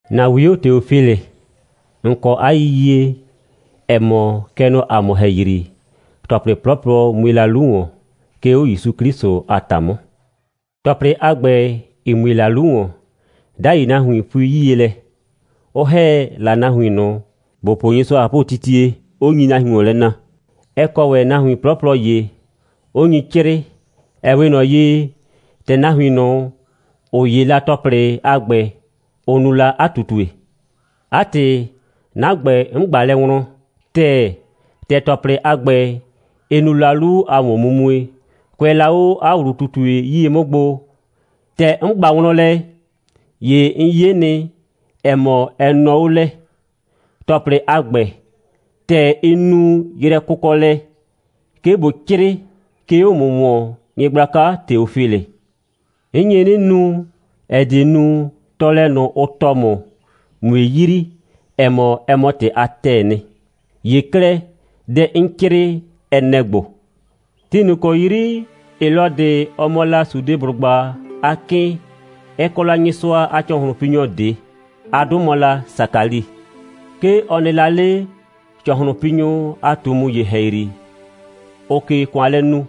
‑Na 'wio Teofilɩ. ‑N kɔ 'a yiyie, ‑ɛ mɔ, kɛ nɔ ‑a mʋ ‑hɛyri, ‑tɔplɩ 'plɔplɔ mue la 'lu ‑wɔn, 'ke 'o ‑Yusu 'Klɩsʋ a ‑ta 'mʋ. ‑Tɔplɩ a ‑gbɛ, ‑ɩ mue la 'lu ‑wɔn, 'dai nahuin pui 'yie lɛ, 'ʋ ‑hɛ la nahuin ꞊nʋ, ‑bʋ po Nyɩsʋa a ꞊hapʋtitie, 'ʋ nyi la nahuin ‑wɔn lɛ na. Ɛ kɔ ‑wɛ nahuin 'plɔplɔ ‑ye, 'ʋ nyi 'crɩɩ, ‑ɛ 'we ꞊nɔ ye, ‑tɛ nahuin ꞊nʋ, ‑ʋ 'ye la ‑tɔplɩ a ‑gbɛ, ʋ nu la 'a ꞊tutue. 'A ‑tɩ, 'na ‑gbɛ, 'n ꞊gba lɛ wlɔn ‑tɛɛ, ‑tɛ ‑tɔplɩ a ‑gbɛ, ɩ nu la 'lu a ‑wɔnmumue, kʋɛ la 'o 'a ‑wlu꞊tutue 'yie 'mʋ gbo. ‑Tɛ 'n ꞊gba wlɔn lɛ, ‑ye 'n 'ye nɩ, ‑ɛ mɔ, ɛ nɔɔ 'o lɛ, ‑tɔplɩ a ‑gbɛ, ‑tɛ ɩ nu yrɛkʋkɔlɛ, 'ke ꞊bo 'crɩɩ, 'ke 'o ‑mʋ ‑wɔn, nyɩgblaka Teofilɩ. 'N nye 'nɩ nu, ‑ɛ die nu, tɔɔlɛ ꞊nʋ, ʋ tɔɔ ‑mʋ, ꞊mue yrii, ‑ɛ mɔ, ɛ mɔ ‑tɩ a ‑tɛɛ nɩ. ‑Ye 'klɛɛ, dɛ 'n 'crɩɩ, ɛ nɛ‑ ‑gbo: Ti ꞊nʋ ‑kɔ 'yri Helɔdɩ mɔ la Sudeblʋgba a 'kɩɩn, ɛ kɔ la Nyɩsʋa a ‑cɔhlʋnpinyɔ ꞊de. 'A 'dʋ mɔ la Sakali. 'Ke ɔ nɩ la 'le ‑cɔhlʋnpinyʋ a ꞊tumu ‑ye ‑hɛyri, ‑ʋʋ ꞊ke ‑kʋan lɛ nu,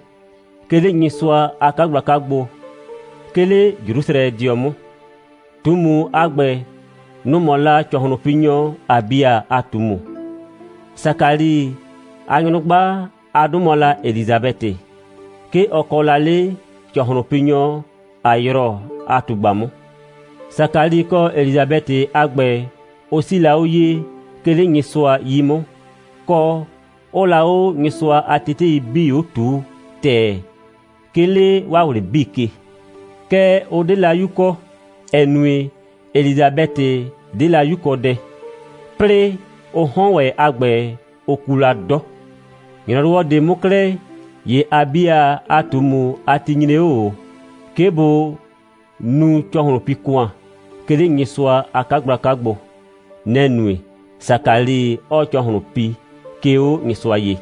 'ke 'le Nyɩsʋa a 'kagblaka gbo, 'ke 'le Jrusrɛdɩɔ 'mʋ. ꞊Tumu a ‑gbɛ, nʋ‑ mɔ la ‑cɔhlʋnpinyɔ Abia a ꞊tumu. Sakali a nyrʋgba, 'a 'dʋ mɔ la Elisabɛtɩ. 'Ke ɔ kɔ la 'le ‑cɔhlʋnpinyɔ Ayrɔ a ꞊tugba 'mʋ. Sakali kɔ Elisabɛtɩ a ‑gbɛ, ʋ 'sii la 'o ye, 'ke 'le Nyɩsʋa 'yi 'mʋ, kɔ, 'ʋʋ la 'o Nyɩsʋa a tetei 'bii 'o ꞊tuu ‑tɛɛ, 'ke 'le 'waa ꞊wlɩ 'bii ke. Kɛɛ, ʋ 'de la 'yu kɔ, ‑ɛ nue, Elisabɛtɩ 'de la 'yukɔdɛ, 'plɩɩ ʋ 'hɔn ‑wɛ a ‑gbɛ, ʋ ku la 'dɔ. ‑Nyrɔwɔ ꞊de 'mʋ 'klɛɛ, ‑ye Abia a ꞊tumu a ti nyre 'o ꞊o, 'ke bʋ nu ‑cɔhlʋnpi‑kʋan, 'ke 'le Nyɩsʋa a 'kagblaka gbo. Nɛ‑ nue, Sakali 'ɔɔ ‑cɔhlʋn pi, 'ke 'o Nyɩsʋa ye.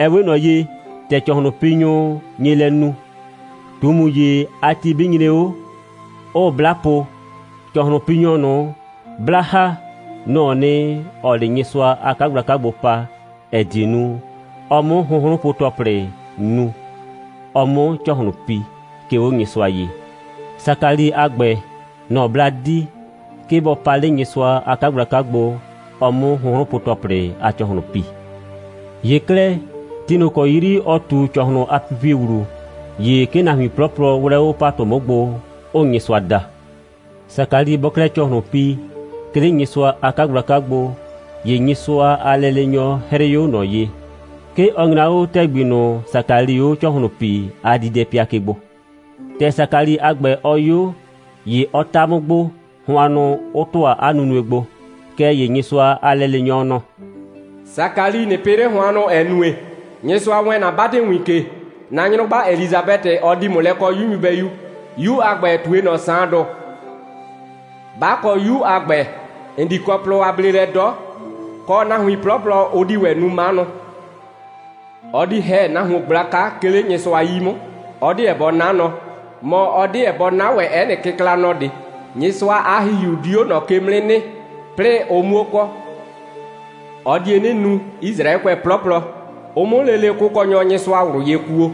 Ɛ 'we ꞊nɔ ye, ‑tɛ ‑cɔhlʋnpinyʋ nye lɛ nu, ꞊tumu ‑ye a ti 'bɩ nyre 'o, 'ʋʋ 'bla po, ‑cɔhlʋnpinyɔ ꞊nʋ, 'blaa ‑ha, nɔ‑ɔ nɩ, ‑ɔɔ 'le Nyɩsʋa a 'kagblaka gbo pa, ‑ɛ die nu, ɔ 'mʋ hʋnhrʋnpo‑tɔplɩ nu, ɔ 'mʋ ‑cɔhlʋn pi, 'ke 'o Nyɩsʋa ye. Sakali a ‑gbɛ, nɔ‑ 'bla di, 'ke bɔ pa 'le Nyɩsʋa a 'kagblaka gbo, ɔ 'mʋ hʋnhrʋnpo‑tɔplɩ a ‑cɔhlʋn pi. ‑Ye 'klɛɛ, ti ꞊nʋ ‑kɔ 'yri ɔ ꞊tu ‑cɔhlʋn a pipie ‑wlu, ‑ye 'ke nahuin 'plɔplɔ 'wlɛ 'o ‑patʋ 'mʋ gbo, 'ʋʋ Nyɩsʋa da. Sakali bɔɔ 'klɛɛ ‑cɔhlʋn pi, 'ke 'le Nyɩsʋa a 'kagblaka gbo, ‑ye Nyɩsʋa a lɛleenyɔ 'hrɩɩ 'o ꞊nɔ ye. 'Ke ɔ nyra 'o ‑tɛgbi ꞊nʋ, Sakalii 'o ‑cɔhlʋn pii a diidɛpɩa ke gbo. ‑Tɛ Sakali a ‑gbɛ, ɔ 'yo, ‑ye ɔ ta 'mʋ gbo, hʋannʋ 'ʋ ‑tʋa 'a nunue gbo. Kɛɛ ‑ye Nyɩsʋa a lɛleenyɔ nɔ: «Sakali, ꞊nɩ pɩ 'le hʋannʋ, ‑ɛ nue, Nyɩsʋa wɛɛn ‑na 'batɩwin ke. ‑Na nyrʋgba Elisabɛtɩ, ɔ di ‑mʋ lɛ kɔɔ 'yu nyɩbɛyu. 'Yu a ‑gbɛ, ꞊tue ꞊nɔ Saandʋ. 'Ba kɔ 'yu a ‑gbɛ, ‑n di kɔ plɔ a bleelɛ 'dɔ, kɔ, nahuin 'plɔplɔ, ʋ di ‑wɛ nu 'manʋ. Ɔ di ‑hɛ nahuon gblaka, 'ke 'le Nyɩsʋa 'yi 'mʋ. Ɔ 'deɛ bɔ 'na nɔ, mɔ, ɔ 'deɛ bɔ 'na ‑wɛ 'ɛ nɩ kɩklanɔ ꞊de. Nyɩsʋa a ‑Hihiu di 'o ꞊nɔ ke 'mʋ 'nɩ nɩ, 'plɩɩ ʋ 'muo kɔ. Ɔ die 'nɩ nu, Yisraɛkʋɛ 'plɔplɔ, ʋ 'mʋ lele Kʋkɔnyɔ Nyɩsʋa ꞊wlʋ ye kuo.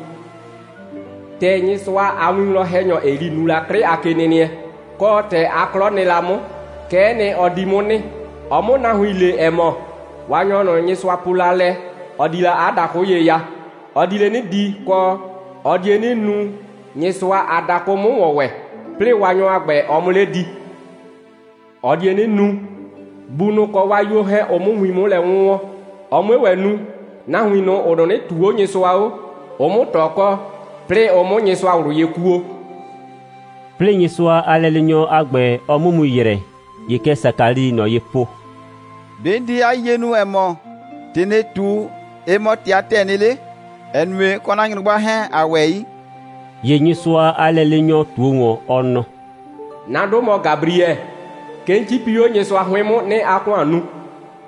‑Tɛ Nyɩsʋa a winwlɔn‑hɛnyɔ Eli nu la 'klɩ a kenɩnɩɛ, kɔ, ‑tɛ 'a 'klɔ nɩ la 'mʋ, kɛ'ɛ nɩ, ɔ di 'mʋ nɩ, ɔ 'mʋ nahuin le, ‑ɛ mɔ, Waanyɔ ꞊nʋ, Nyɩsʋa po la lɛ, ɔ di la 'a dakʋ ye ya, ɔ di 'le 'nɩ di, kɔ, ɔ die 'nɩ nu, Nyɩsʋa a dakʋ 'mʋ ‑wɔn ‑wɛ, 'plɩɩ Waanyɔ a ‑gbɛ, ɔ 'mʋ 'le di. Ɔ die 'nɩ nu, bunʋ kɔ 'waa 'yuo 'hɛɛn, ʋ 'mʋ win 'mʋ lɛ 'wʋnwɔn, ɔ 'mue ‑wɛ nu, nahuin ꞊nʋ, ‑ʋ 'nɩnɩ ꞊tuu 'o Nyɩsʋa 'o, ʋ 'mʋ ꞊tɔ kɔ, 'plɩɩ ʋ 'mʋ Nyɩsʋa ꞊wlʋ ye kuo.» 'Plɩɩ Nyɩsʋa a lɛleenyɔ a ‑gbɛ, ɔ 'mʋ mu ‑yrɛ, ‑ye kɛ Sakalii ꞊nɔ ye po: «‑Be' 'n di 'a yiyie nu, ‑ɛ mɔ, ‑tɩ ‑nɩɩ ꞊tu, ɩ mɔ ‑tɩ a ‑tɛɛ nɩ 'le? ‑Ɛ nue, 'n kɔ 'na nyrʋgba 'hɛɛn, ‑a ‑wɛ 'yi.» ‑Ye Nyɩsʋa a lɛleenyɔ ꞊tuo ‑wɔn, ɔ nɔ: «'Na 'dʋ mɔ Gabriɛ. 'Ke 'n 'cipi 'o Nyɩsʋa 'hʋɩn 'mʋ, 'nɩɩ 'a ‑kʋan nu.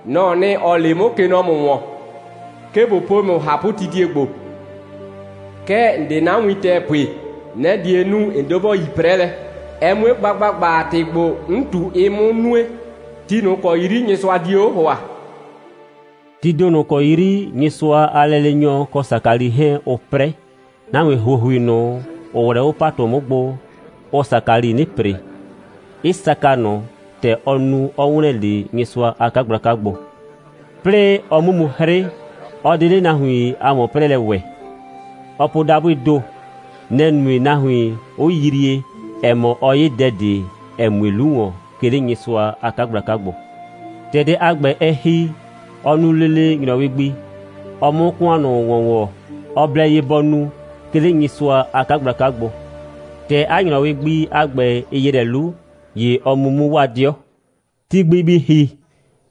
Nɔ‑ɔ nɩ, ‑ɔ le 'mʋ, kɛ nɔ ‑mʋ ‑wɔn, 'ke ꞊bo pue ‑mʋ ꞊hapʋtitie ‑gbo. Kɛɛ, ‑n 'de 'na win ‑tɛɛ pue. Nɛ‑ die nu, ‑n 'deɛ ‑bo yi 'prɛlɛ, ɛ 'mue gba ‑gbagba, ‑tɩ ‑gbo 'n ꞊tu, ɩ 'mʋ nue, ti ꞊nʋ ‑kɔ 'yri Nyɩsʋa die 'o ‑hʋa.» Tii ‑do ꞊nʋ ‑kɔ 'yri Nyɩsʋa a lɛleenyɔ kɔ Sakali 'hɛɛn, ʋʋ 'prɛ, nahuin ‑huohui ꞊nʋ, ‑ʋ 'wlɛ 'o ‑patʋ 'mʋ gbo, ʋʋ Sakali 'nɩ ‑pre, 'ɩ saka ꞊nʋ, ‑tɛ ɔ nu, 'ɔ ‑wlɛn 'le Nyɩsʋa a 'kagblaka gbo. 'Plɩɩ ɔ 'mʋ mu 'hrɩ, ɔ 'de 'le nahuin a ‑wɔn'prɛɛlɛ ‑wɛ. Ɔɔ po dabʋɩɩ ‑do. Nɛ‑ nue, nahuin 'ʋ yrie, ‑ɛ mɔ, ɔ 'ye dɛ ꞊de, ‑ɛ mue 'lu ‑wɔn, 'ke 'le Nyɩsʋa a 'kagblaka gbo. ‑Tɛ dɛ a ‑gbɛ, ɛ ‑hi, ɔ nu lele ‑nyrɔwɩ gbi, ɔ 'mʋ ‑kʋan ꞊nʋ ‑wɔn ‑wɔ, ɔ blɛ ye bɔ nu, 'ke 'le Nyɩsʋa a 'kagblaka gbo. ‑Tɛ 'a ‑nyrɔwɩ gbi a ‑gbɛ, ɩ ‑yrɛ 'lu, ‑ye ɔ mu 'mʋ 'waa 'dɩɔ. Ti gbi bɩ ‑hi,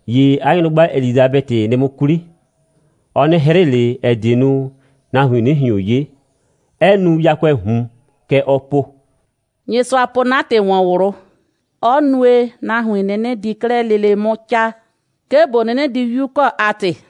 ‑ye 'a nyrʋgba Elisabɛtɩ nɩ 'mʋ 'kwli. Ɔ 'nɩ 'hrɩ ꞊le, ‑ɛ die nu, nahuin 'nɩ ꞊hion 'ye, 'ɛ nu yakʋɛɛ ꞊hun. Kɛ ɔɔ po: «Nyɩsʋa po 'na ‑tɩ ‑wɔn ꞊wlʋ, 'ɔ nue, nahuin 'ʋ 'nɩnɩ di 'klɛɛ lele 'mʋ 'caa, 'ke ꞊bo 'nɩnɩ di 'yu kɔ a ‑tɩ.»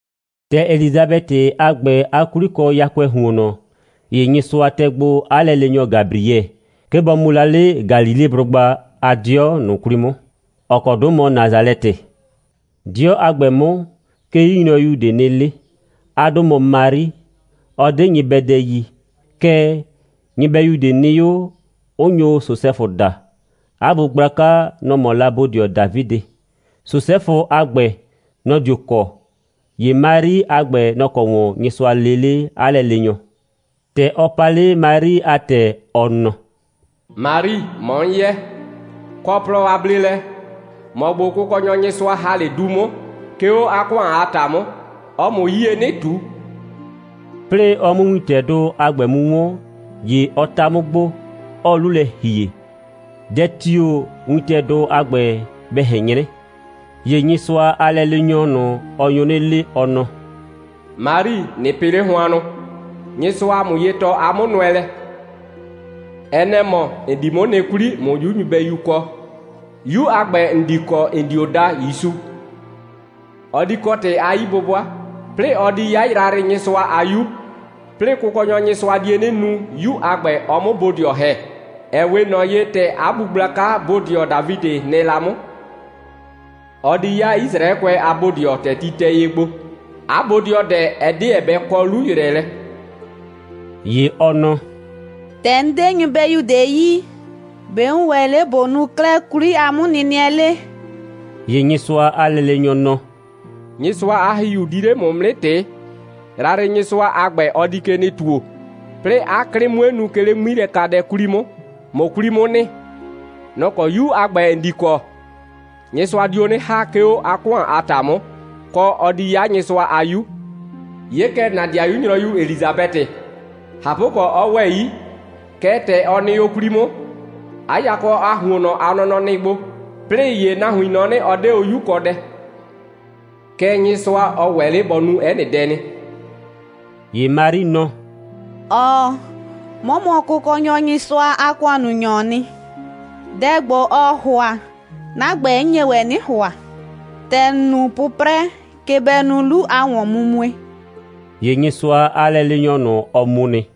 ‑Tɛ Elisabɛtɩ a ‑gbɛ a 'kwli kɔ yakʋɛɛ ‑huonnɔ, ‑ye Nyɩsʋa tɛ gbo 'a lɛleenyɔ Gabriɛ, 'ke bɔ mu la 'le Galileblʋgba a 'dɩɔ ꞊nʋ 'kwli 'mʋ, ‑ɔ kɔ 'dʋ mɔ Nasalɛtɩ. 'Dɩɔ a ‑gbɛ 'mʋ, 'ke 'yunyrɔyu ꞊de nɩ 'le. 'A 'dʋ mɔ Mari. Ɔ 'de nyɩbɛdɛ yi. Kɛɛ, nyɩbɛyu ꞊de nɩ 'o, 'ʋ nyo Sosɛfʋ daa. 'A bu gblaka, nɔ‑ mɔ la bodɩɔ Dafidɩ. Sosɛfʋ a ‑gbɛ, nɔ‑ dio kɔ. ‑Ye Mari a ‑gbɛ, nɔ‑ kɔ ‑wɔn Nyɩsʋa lee 'le 'a lɛleenyɔ. ‑Tɛ ɔ pa 'le Mari a ‑tɛ, ɔ nɔ: «Mari, ‑mɔ 'n yɛ. Kɔ plɔ a bleelɛ! ‑Mɔ ‑gbo Kʋkɔnyɔ Nyɩsʋa ‑ha 'le du 'mʋ, 'ke 'o 'a ‑kʋan a ‑ta 'mʋ. Ɔɔ ‑mʋ 'yie 'nɩ ꞊tu.» 'Plɩɩ ɔ 'mʋ wintɛdʋ a ‑gbɛ mu 'wɔn, ‑ye ɔ 'ta 'mʋ gbo, 'ɔɔ 'lu lɛ ‑hie, dɛ tio‑ wintɛdʋ a ‑gbɛ bɛ ꞊hɛn 'nyrɛ. ‑Ye Nyɩsʋa a lɛleenyɔ ꞊nʋ, ɔ nyo 'nɩ le, ɔ nɔ: «Mari, ꞊nɩ pɩ 'le hʋannʋ! Nyɩsʋaa ‑mʋ ye tɔɔ 'a 'mʋnʋɛlɛ. Ɛ nɛ‑ mɔ, ‑n di 'mʋ nɩ 'kwli, ꞊mʋ 'yu nyɩbɛyu kɔ. 'Yu a ‑gbɛ, ‑n di kɔ, ‑n dio daa ‑Yusu. Ɔ di kɔ ‑tɩ a 'yi'bʋbʋa, 'plɩɩ ɔ di 'ya Yrayrɩnyɩsʋa a 'Yu, 'plɩɩ Kʋkɔnyɔ Nyɩsʋa die 'nɩ nu, 'yu a ‑gbɛ, ɔ 'mʋ bodɩɔ ‑hɛ, ‑ɛ 'we ꞊nɔ ye, ‑tɛ 'a bu gblaka bodɩɔ Dafidɩ nɩ la 'mʋ. Ɔ di 'ya Yisraɛkʋɛ a bodɩɔ, ‑tɛ ti tɛ ye gbo. 'A bodɩɔdɛ, ɛ 'deɛ bɛ kɔ 'lu‑yrɛɛlɛ.» ‑Ye ɔ nɔ: «‑Tɛ 'n 'de nyɩbɛyu ꞊de yi, ‑be' 'n ‑wɛ 'le ꞊bo nu 'klɛɛ 'kwli a 'mʋnɩnɩɛ 'le?» ‑Ye Nyɩsʋa a lɛleenyɔ nɔ: «Nyɩsʋa a ‑Hihiu di 'le ‑mʋ 'mʋ 'nɩ ꞊tɩɩ. Yrayrɩnyɩsʋa a ‑gbɛ, ɔ di ke nɩ ‑tuo, 'plɩɩ 'a 'klɩ 'mue nu, 'ke 'le 'ŋmilɛkadɛ 'kwli 'mʋ, ꞊mʋ 'kwli 'mʋ nɩ. Nɔ‑ kɔ 'yu a ‑gbɛ, ‑n di kɔ, Nyɩsʋa dio 'nɩ ‑ha, 'ke 'o 'a ‑kʋan a ‑ta 'mʋ, kɔ, ɔ di 'ya Nyɩsʋa a 'Yu. 'Ye kɛ, ‑na 'dɩayu nyrɔyu Elisabɛtɩ, ꞊hapʋkɔ, 'ɔ ‑wɛ 'yi, kɛɛ, ‑tɛ ɔ nɩ o 'kwli 'mʋ, 'a yakɔ a ‑huonnɔ a nɔnɔ nɩ gbo, 'plɩɩ ‑ye nahuin nɔ 'nɩ, ɔ 'de o 'yukɔdɛ. Kɛɛ, Nyɩsʋa, ɔ ‑wɛ 'le bɔ nu 'ɛ nɩ dɛ nɩ.» ‑Ye Mari nɔ: «‑Ɔɔ, 'mɔ mɔ Kʋkɔnyɔ Nyɩsʋa a ‑kʋannunyɔɔ nɩ. Dɛ ‑gbo, ɔɔ ‑hʋa, 'na ‑gbɛ, 'n nye ‑wɛ 'nɩ ‑hʋa. ‑Tɛ ‑n nu 'pʋprɛ, kɛ bɛ nu 'lu a ‑wɔnmumue.» ‑Ye Nyɩsʋa a lɛleenyɔ ꞊nʋ, ɔ mu nɩ.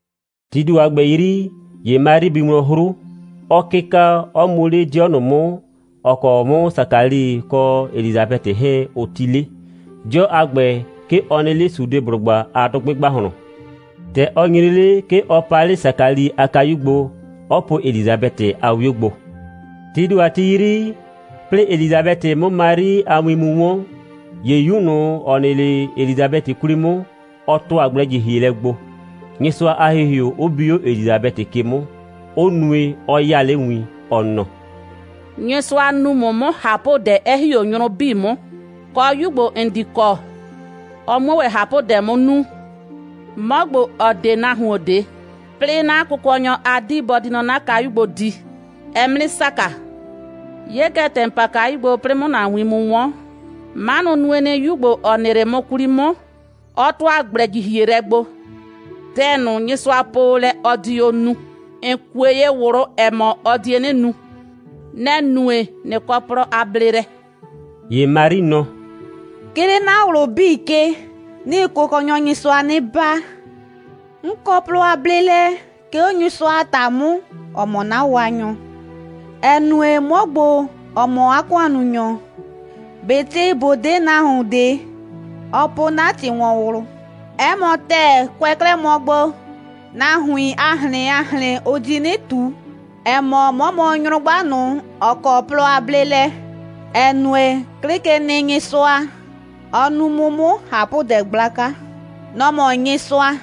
Tii ‑do a ‑gbɛ 'yri, ‑ye Mari bi wlɔn 'hru, 'ɔ 'kɩka, 'ɔ mu 'le 'dɩɔ ꞊nʋ 'mʋ, ‑ɔ kɔ 'mʋ Sakali kɔ Elisabɛtɩ 'hɛɛn, ʋ 'ti 'le. 'Dɩɔ a ‑gbɛ, 'ke ɔ nɩ 'le Sudeblʋgba a dʋgbɩ ‑gbahlɔn. ‑Tɛ ɔ nyre 'le, 'ke ɔ pa 'le Sakali a kayu gbo, 'ɔ po Elisabɛtɩ a 'wio gbo. Tii ‑do a ti 'yri, 'plɩɩ Elisabɛtɩ 'mʋ Mari a win mu 'wɔn, ‑ye 'yu ꞊nʋ, ‑ɔ nɩ 'le Elisabɛtɩ 'kwli 'mʋ, ɔ ‑tʋa gblɛ‑jihielɛ gbo, Nyɩsʋa a ‑Hihiu 'ʋ bi 'o Elisabɛtɩ ke 'mʋ, 'ʋ nue, 'ɔ 'yaa 'le win, ɔ nɔ: «Nyɩsʋa nu ‑mʋ 'mʋ ꞊hapʋdɛ, 'ɛ ‑hi 'o nyrʋ 'bii 'mʋ, kɔ, 'yu ‑gbo, ‑n di kɔ, ɔ 'muo ‑wɛ ꞊hapʋdɛ 'mʋ nu. 'Mɔ ‑gbo, ‑ɔ 'de nahuon ꞊de, 'plɩɩ 'na Kʋkɔnyɔ a 'dii, bɔ di nɔ 'na kayu gbo di, ɛɛ 'mʋ 'nɩ saka. 'Ye kɛ, ‑tɛ ‑n pa kayu gbo, 'plɩɩ 'mʋ ‑na win mu 'wɔn, 'manʋ nue nɩ, 'yu ‑gbo, ‑ɔ nɩ 'le 'mʋ 'kwli 'mʋ, 'ɔ ‑tʋa gblɛ‑jihielɛ gbo. Dɛ ꞊nʋ, Nyɩsʋa po o lɛ, ɔ di o nu, ‑n kue ye ꞊wlʋ, ‑ɛ mɔ, ɔ die 'nɩ nu. Nɛ‑ nue, ꞊nɩ kɔ plɔ a bleelɛ.» ‑Ye Mari nɔ: «'Ke 'le 'na ꞊wlʋ 'bii ke, 'nɩɩ Kʋkɔnyɔ Nyɩsʋa 'nɩ baa. 'N kɔ plɔ a bleelɛ, 'ke 'o Nyɩsʋa a ‑ta 'mʋ, ‑ɔ mɔ 'na Waanyɔ, ‑ɛ nue, 'mɔ ‑gbo, ‑ɔ mɔ 'a ‑kʋannunyɔ, ꞊betɩ ꞊bo 'de nahuon ꞊de, ɔ po 'na ‑tɩ ‑wɔn ꞊wlʋ. 'Ɛ mɔ ‑tɛɛ, kʋɛ 'klɛɛ mɔ gbo, nahuin a ꞊hrɩn a ꞊hrɩn, ʋ di 'nɩ ꞊tu, ‑ɛ mɔ, 'mɔ mɔ nyrʋgba ꞊nʋ, ‑ɔ kɔ plɔ a bleelɛ, ‑ɛ nue, 'Klɩkenɩnyɩsʋa, ɔ nu 'mʋ 'mʋ ꞊hapʋdɛ gblaka. Nɔ‑ mɔ Nyɩsʋa.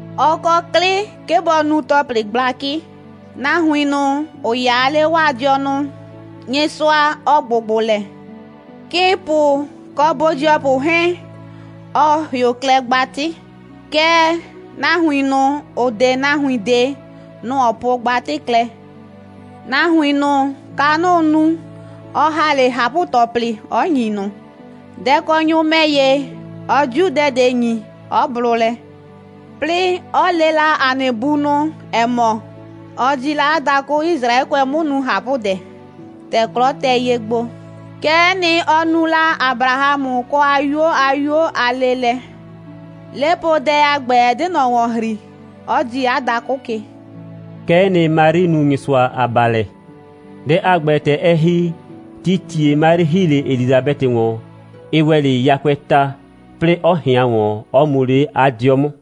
Ɔ kɔ 'klɩ, 'ke bɔ nu ‑tɔplɩ gblakɩ: Nahuin ꞊nʋ, ‑ʋ 'yaa 'le 'waa dɩɔnʋ, Nyɩsʋa, ɔ ‑gbʋgbʋ lɛ. 'Kɩɩnpʋ kɔ bodɩɔpʋ 'hɛɛn, ɔ ‑hɩʋ klɛ gbatɩ, kɛɛ, nahuin ꞊nʋ, ‑ʋ 'de nahuin ꞊de, nʋ‑ ɔ po gbatɩ klɛ. Nahuin ꞊nʋ, kanʋʋ nu, ɔ ‑ha 'le ꞊hapʋ‑tɔplɩ, 'ɔ ‑nyi ꞊nʋ. Dɛkɔnyʋ ‑mɛ ‑ye, ɔ 'diu dɛ ꞊de ‑nyi, 'ɔ blʋ lɛ. 'Plɩɩ, 'ɔ le la ‑a nɩ bunʋ, ‑ɛ mɔ, ɔ di la 'a dakʋ Yisraɛkʋɛ 'mʋ nu ꞊hapʋdɛ, ‑tɛ 'klɔ tɛ ye gbo. Kɛ'ɛ nɩ, ɔ nu la Abrahamʋ kɔ 'a 'yuo a 'yuo a leelɛ. 'Lepoodɛ a ‑gbɛ, ɛ 'de ꞊nɔ ‑wɔn ‑hri, 'ɔ dii 'a dakʋ ke.» Kɛ'ɛ nɩ, Mari nu Nyɩsʋa a baalɛ. Dɛ a ‑gbɛ, ‑tɛ ɛ ‑hi, tii ‑tie Mari ‑hi 'le Elisabɛtɩ ‑wɔn, ɩ ‑wɛ 'le yakʋɛɛ ta, 'plɩɩ 'ɔ ꞊hɩan ‑wɔn, 'ɔ mu 'le 'a 'dɩɔ 'mʋ.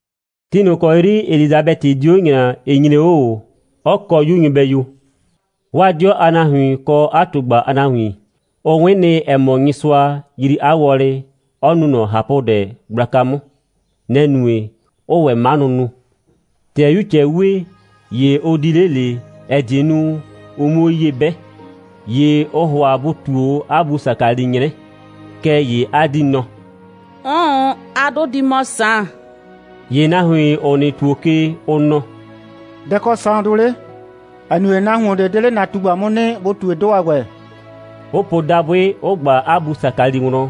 Ti ꞊nʋ ‑kɔ 'yri Elisabɛtɩ di 'o ‑ŋlaa, ɩ nyre 'o ꞊o, 'ɔ kɔ 'yu nyɩbɛyu. 'Waa 'dɩɔ a nahuin kɔ 'a ꞊tugba a nahuin, ʋ 'wɩn nɩ, ‑ɛ mɔ, Nyɩsʋa yrii 'a wɔlɩ, 'ɔ nu ꞊nɔ ꞊hapʋdɛ gblaka 'mʋ. Nɛ‑ nue, 'ʋʋ ‑wɛ 'manʋ nu. ‑Tɛ 'yu ꞊cɛɛ 'wee, ‑ye ʋ di 'le ꞊le, ‑ɛ die nu, ʋ 'muo ye 'bɛ. ‑Ye ʋʋ ‑hʋa bʋ ꞊tuo 'o 'a bu Sakali 'nyrɛ. Kɛɛ ‑ye 'a 'dii nɔ: «'Ʋʋn, 'a 'dʋ di mɔ Saan.» ‑Ye nahuin, ‑ʋ nɩ ‑tuo ke, ʋ nɔ: «Dɛ‑ kɔ Saandʋ 'le, ‑ɛ nue, nahuon ꞊de 'de 'le ‑na ꞊tugba 'mʋ nɩ, bʋ ꞊tue 'dʋ a ‑gbɛ,» 'ʋ po dabʋɩ, 'ʋ ꞊gba 'a bu Sakali wlɔn,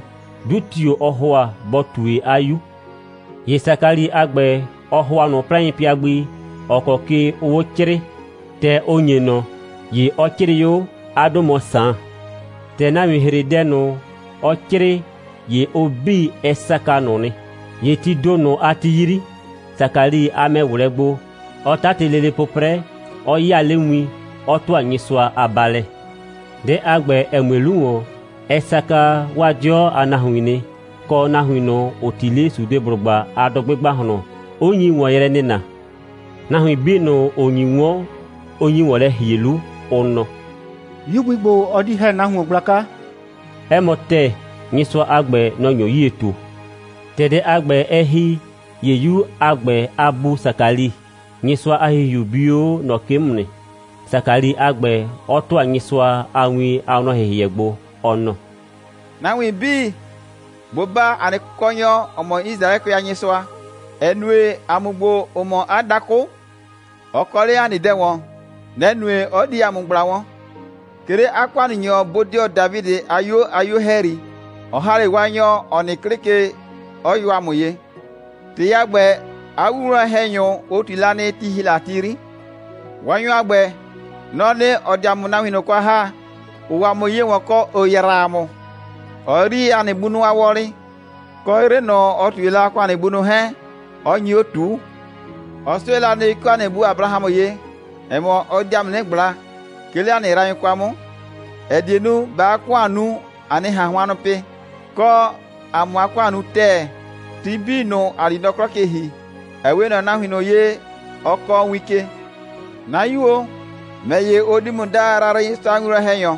'dʋ tio‑ ɔɔ ‑hʋa bɔ ꞊tue 'a 'yu. ‑Ye Sakali a ‑gbɛ, ɔ ‑hʋa ꞊nʋ 'plaɩnpɩa gbi, ‑ɔ kɔ ke ʋʋ 'o 'crɩɩ. ‑Tɛ ʋ ‑nye ꞊nɔ, ‑ye ɔ 'crɩɩ 'o: «'A 'dʋ mɔ Saan.» ‑Tɛ nahuin ‑hre dɛ ꞊nʋ, ɔ 'crɩɩ, ‑ye ʋ 'bii, ɛ saka ꞊nʋ nɩ. ‑Ye tii ‑do ꞊nʋ a ti 'yri, Sakali a mɛ ꞊wlɛɛ gbo, 'ɔ 'tatɩ lele 'pʋprɛ, 'ɔ 'yaa 'le win, 'ɔ ‑tʋa Nyɩsʋa a baalɛ. Dɛ a ‑gbɛ, ‑ɛ mue 'lu ‑wɔn, ɛ saka 'waa 'dɩɔ a nahuin nɩ, kɔ, nahuin ꞊nʋ, ‑ʋ 'ti 'le Sudeblʋgba a dʋgbɩ ‑gbahlɔn, 'ʋ nyi ‑wɔn yrɛ nɩna. Nahuin 'bii ꞊nʋ, ‑ʋ nyi 'wɔn, ʋ nyi ‑wɔn lɛ ‑hie 'lu, ʋ nɔ: «'Yu gbi ‑gbo le, ɔ di ‑hɛ nahuon gblaka.» 'Ɛ mɔ ‑tɛɛ, Nyɩsʋa a ‑gbɛ, nɔ‑ nyo 'yie ꞊tu. ‑Tɛ dɛ a ‑gbɛ, ɛ ‑hi, ‑ye 'yu a ‑gbɛ a bu Sakali, Nyɩsʋa a ‑Hihiu bi 'o ꞊nɔ ke 'mʋ nɩ, Sakali a ‑gbɛ 'ɔ ‑tʋa Nyɩsʋa a win a wlɔn‑hɩhɩɛ gbo, ɔ nɔ: «Nahuin 'bii, bʋ baa ‑a nɩ Kʋkɔnyɔ, ‑ɔ mɔ Yisraɛkʋɛ a Nyɩsʋa, ‑ɛ nue, ‑a mʋ ‑gbo, ‑ʋ mɔ 'a dakʋ, ɔ kɔ 'le ‑a nɩ dɛ ‑wɔn. Nɛ‑ nue, 'ɔ di ‑a mʋ ꞊gbla wɔn. 'Ke 'le 'a ‑kʋannunyɔ bodɩɔ Dafidɩ a 'yuo a 'yuo ‑hɛyri, ɔ ‑ha 'le Waanyɔ, ‑ɔ nɩ 'klɩ ke, 'ɔ yɔ ‑a mʋ ye. ‑Tɩ a ‑gbɛ, 'a winwlɔn‑hɛnyʋ, ʋ ꞊tui la nɩ, ti ‑hi la a ti 'yri. Waanyɔ a ‑gbɛ, nɔ‑ɔ nɩ, ‑ɔ di ‑a mʋ nahuin ꞊nʋ kwa ‑ha, ‑ʋʋ ‑a mʋ ye ‑wɔn, kɔ, ‑ʋ yraa ‑a mʋ. Ɔ yrii ‑a nɩ bunʋ a wɔlɩ, kɔ, 'yrɩ ꞊nʋ, ɔ ꞊tue la, ɔ kɔ ‑a nɩ bunʋ 'hɛɛn, ɔ nyi 'o 'nɩ ꞊tuu. Ɔ 'sʋɛ la nɩ, 'ke 'o ‑a nɩ bu Abrahamʋ ye, ‑ɛ mɔ, ɔ di ‑a mʋ 'nɩ ꞊gbla, 'ke 'le ‑a nɩ yraanyʋ kwa 'mʋ, ‑ɛ die nu, ꞊baa 'a ‑kʋan nu, ‑a 'nɩ ꞊han hʋannʋ pɩ, kɔ, ‑a 'mʋ 'a ‑kʋan nu ‑tɛɛ, ti 'bii ꞊nʋ, ‑a di nɔ 'klɔ ke ‑hi, ‑ɛ 'we ꞊nɔ nahuin ꞊nʋ ye, ɔ kɔɔ win ke. 'Na 'yu o, ‑mɛ ‑ye, ʋ di ‑mʋ daa Yrayrɩnyɩsʋa a winwlɔn‑hɛnyɔ,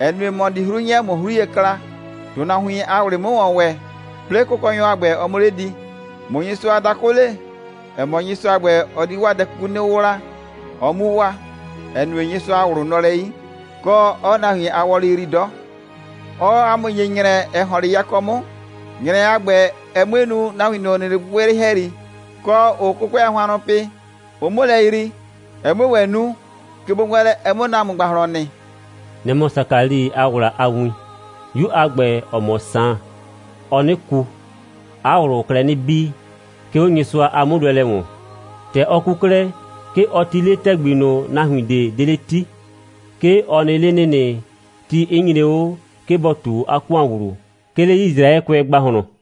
‑ɛ nue, ‑mɔ di 'hru 'nyɛ, ꞊mʋ 'hru ye kla, ‑tʋnahuin a ꞊wlɩ 'mʋ ‑wɔn ‑wɛ, 'plɩɩ Kʋkɔnyɔ a ‑gbɛ, ɔ 'mʋ 'le di, ꞊mʋ Nyɩsʋa a dakʋ le, ‑ɛ mɔ, Nyɩsʋa a ‑gbɛ, ɔ di 'waa dɛ 'kuku 'nɩ 'wʋwla, ɔ 'mu waa, ‑ɛ nue, Nyɩsʋa a ꞊wlʋ nɔ lɛ 'yi, kɔ, 'ɔɔ nahuin a wɔlɩ yrii 'dɔ. Ɔɔ ‑a mʋ ‑nye ‑nyrɛ, ‑ɛ ‑hɔn 'le yakɔ 'mʋ, ‑nyrɛ a ‑gbɛ, ɛ 'mue nu, nahuin ꞊nʋ, ‑ʋ nɩ 'le gbɩgbɩyrɩ ‑hɛyri, kɔ, ‑ʋʋ 'kʋkʋɛ a hʋannʋ pɩ, ʋ 'mʋ lɛ yrii, ɛ 'mue ‑wɛ nu, kegbowɛɛnlɛ, ɛ 'mʋ nɔ ‑a mʋ ‑gbahlɔn nɩ.» Nɛ‑ mɔ Sakali a ‑wla a win. 'Yu a ‑gbɛ, ‑ɔ mɔ Saan, ɔɔ 'nɩ ku, 'a ꞊wlʋʋ klɛ 'nɩ bii, 'ke 'o Nyɩsʋa a 'mʋnʋɛlɛ ‑wɔn. ‑Tɛ ɔ ku 'klɛɛ, 'ke ɔ 'ti 'le ‑tɛgbi ꞊nʋ, nahuin ꞊de 'de 'le 'ti. 'Ke ɔ nɩ 'le ‑nɩnɩ, ti 'ɩ nyre 'o, 'ke bɔ ꞊tu 'a ‑kʋan ‑wlu, 'ke 'le Yisraɛkʋɛ ‑gbahlɔn.